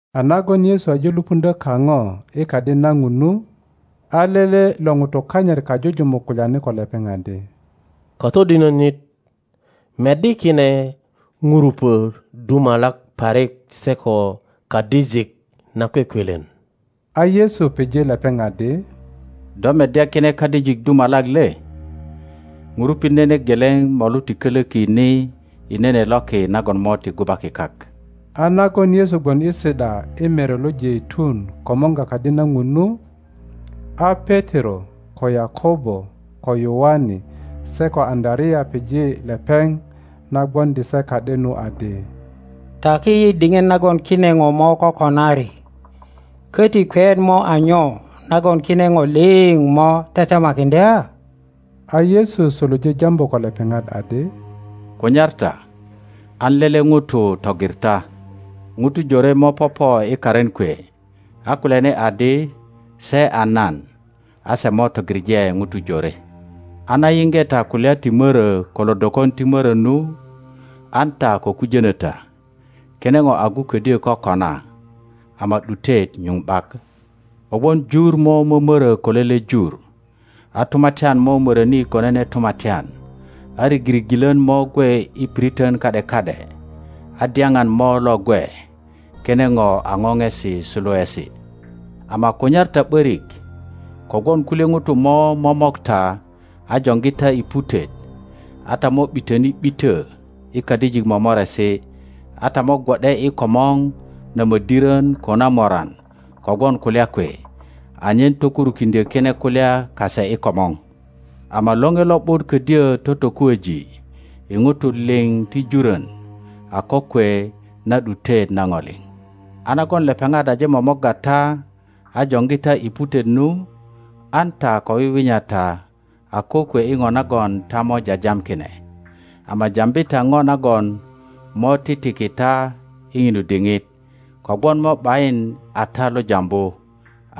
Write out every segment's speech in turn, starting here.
A nagon Yesu aje lupuŋdyö kaŋo i Kadi na Ŋun nu, a lele lo ŋutu kanyit kajujumuk kulyani ko lepeŋ adi, Katodinönit! Meddi kine ŋurupö dumalak parik se ko kadijik nakwekwelen! A Yesu pije lepeŋ adi, Do meddya kine kadijik dumalak le? Ŋurupit nene geleŋ molu ti kölöki ni i nene loki nagon mo ti gubaki kak. A nagon Yesu gwon i si ’da i Mere lo Jeitun komorga Kadi na Ŋun nu, a Petero, ko Yakobo, ko Yoane se ko Aŋöarea pije lepeŋ na gwoŋdi se ka ’de nu, adi, Taki yi diŋit nagon kine ŋo mo kokonari, köti kweyet mo a nyo nagon kine ŋo liŋ mo tetemakiŋdya? A Yesu suluje jambu ko lepeŋat adi, Kunyar ta an lele ŋuto togir ta. Ŋutu jore mo popo i karin kwe a kulyani adi se a nan, a se mo togiŋe ŋutu jore. A na yiŋge ta kulya ti mörö ko lodokon ti mörö nu, an ta ko kujönö ta; kine ŋo agu ködyö kokona, ama ’dutet nyuŋ ’bak. Kogwon jur mo mömörö ko lele jur, a tumatyan mo möröni ko nene tumatyan, a rigirigilön mo gwe i piriton ka ’de ka ’de, a dyaŋan mo lo gwe; kine ŋo a ŋoŋesi suluesi. Ama kunyar ta ’börik; kogwon kulye ŋutu mo momok ta a joŋgi ta i putet; a ta mo ’bitöni ’bitö i kadijik momoresi, a ta mo gwo ’de i komor na mödirön ko na moran kogwon kulya kwe, anyen tokurukiŋdyö kine kulya kase i komor. Ama Loŋe Lo ’but ködyö totokuoŋ i ŋutu liŋ ti jurön a kokwe na ’dutet na ŋo liŋ. A nagon lepeŋat aje momorga ta a joŋgi ta i putet nu, an ta ko wiwinya ta a kokwe i ŋo nagon ta mo jajam kine; ama jambi ta ŋo nagon mo titiki ta i ŋinu diŋit, kogwon mo ’bayin a ta lo jambu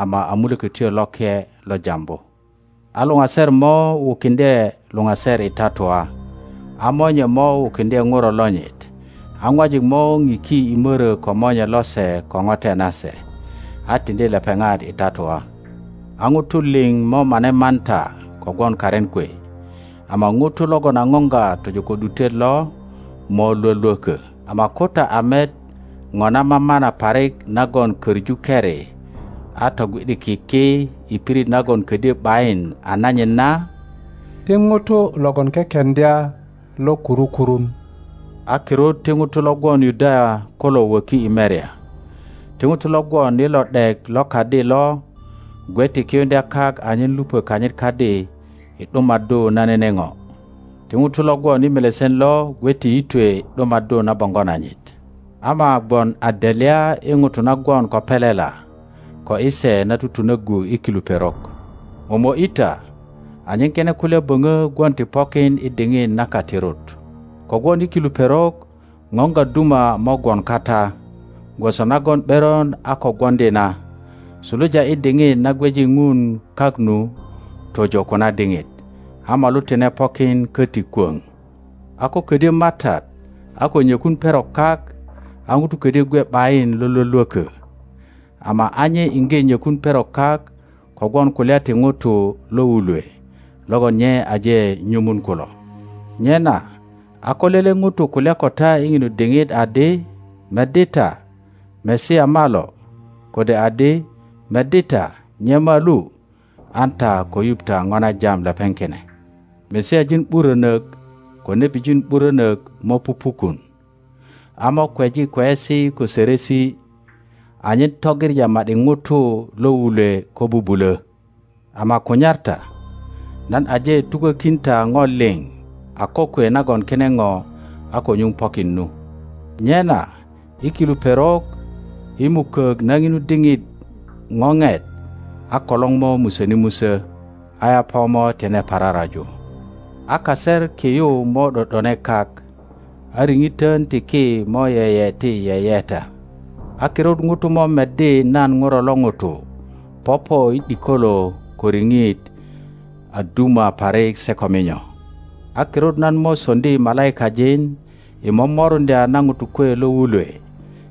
ama a Mulökötyo Loke lo jambu. A luŋaser mo wukiŋdye luŋaser i tatua, monye mo wukiŋdye Ŋuro lonyit, a ŋwajik mo ŋiki i mörö ko monye lose ko ŋote nase, a tiŋdi lepeŋat i tatua; a ŋutu liŋ mo mane man ta kogwon karin kwe. Ama ŋuto logon a ŋoŋga tojo ko ’dutet lo mo lwölwökö. Ama ko ta a met ŋo na mamana parik nagon koŋu keri a togwi ’diki ki i pirit nagon ködyö ’bayin a nanyit na, (ti ŋuto logon kekeŋdya lo kuru kurun), a kirut ti ŋutu lo gwon Yudaya kulo wöki i merya. Ti ŋuto lo gwon i lo ’dek lo kadi lo gwe ti kiyuŋdya kak anyen lupö kanyit kadi i ’dumaddu na nene ŋo. Ti ŋuto lo gwon i melesen lo gwe ti yitwe i ’dumaddu na boŋgo nanyit. Ama gwon a delya i ŋutu na gwon ko pelela, ko i se na tutunöggu i kilu perok! Momo ’yi ta anyen kine kulya böŋö gwon ti pokin i diŋit na katirut. Kogwon i kilu perok ŋoŋga duma mo gwon kata gwoso nagon ’beron a ko gwoŋdi na, suluja i diŋit na gweji Ŋun kak nu, tojo ko na diŋit, a molu tine pokin köti kwöŋ. a ko ködyö MATAT a ko nyökun perok kak, a ŋuto ködyö gwe ’bayin lo lwölwökö; ama a nye iŋge nyökun perok kak kogwon kulya ti ŋutu lo wulwe logon nye aje nyumun kulo. Nyena a ko lele ŋuto kulya ko ta i ŋinu diŋit adi, Meddi ta, Masia malo! kode adi, Meddi ta, nye malu! an ta ko yuŋ ta ŋo na jam lepeŋ kine. Masiajin ’burönök ko nebijin ’burönök mo pupukun, a mo kweji kweyesi ko ŋo sörösi, anyen togiŋa ma ’di ŋutu lo wulwe ko bubulö. Ama kunyar ta; nan aje tukokin ta ŋo liŋ a kokwe nagon kine ŋo a ko nyuŋ pokin nu. Nyena i kilu perok, i mukök na ŋinu diŋit ŋoŋet, a kolor mo musöni musö, a yaŋa mo tine pararaju, a kaser ki yu mo ’do ’done kak, a riŋitön ti ki mo yeyeti yeyeta. a kirut ŋutu mo meddi nan Ŋuro lo ŋuto popo i ’dikolo ko riŋit a duma parik se ko minyo. A kirut nan mo soŋdi malaikajin i momoruŋdya na ŋutu kwe lo wulwe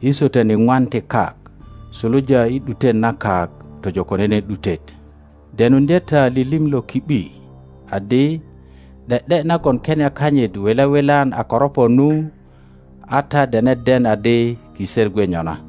i swötön iŋwan ti kak, suluja i ’dutet na kak tojo ko nene ’dutet. Denuŋdye ta lilim lo ki ’bi adi, ’De ’de nagon kenia kanyit wile wilan a koropo nu, a ta dene den adi kiser gwe nyona.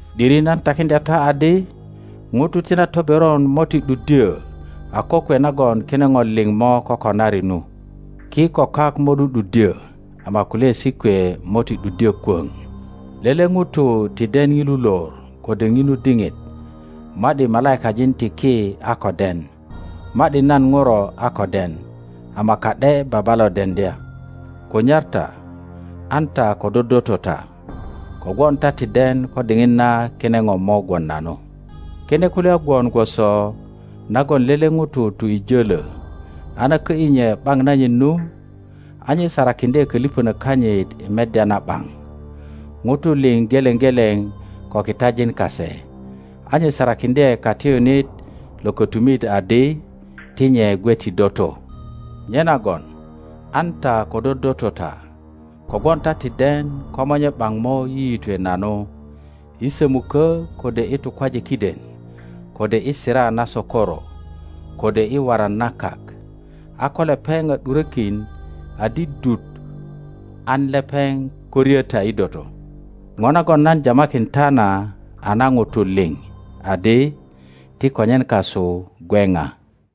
’Diri nan takiŋdya ta adi, ŋutu ti na toberon mo ti ’duddyö a kokwe nagon kine ŋo liŋ mo kokonari nu. Ki ko kak mo ’du ’duddyö, ama kulyaesi kwe mo ti ’duddyö kwöŋ. Lele ŋuto ti den ŋilu lor kode ŋinu diŋit, ma ’di malaikajin ti ki a ko den, ma ’di nan Ŋuro a ko den, ama ka ’de Baba lo deŋdya. Kunyar ta, an ta ko dodoto ta; kogwon ta ti den ko diŋit na kine ŋo mo gwon nanu. Kine kulya gwon gwoso nagon lele ŋuto tu i jölö, a na kö ’yi nye ’baŋ nanyit nu, a nye sarakiŋdye kölipönök kanyit i meddya na ’baŋ, ŋutu liŋ geleŋ geleŋ ko kitajin kase, a nye sarakiŋdye katiyunit lo kötumit adi ti nye gwe ti doto. Nyenagon an ta ko dodoto ta, kogwon ta ti den ko monye ’baŋ mo yiyitwe nanu, i sömukö kode i tukwaje kiden, kode i sira na sokoro, kode i waran na kak; a ko lepeŋ a ’durökin adi dut an lepeŋ ko ryö ta i doto. ŋo nagon nan jamakin ta na a na ŋutu liŋ adi, Ti konyen kasu gwe ŋa.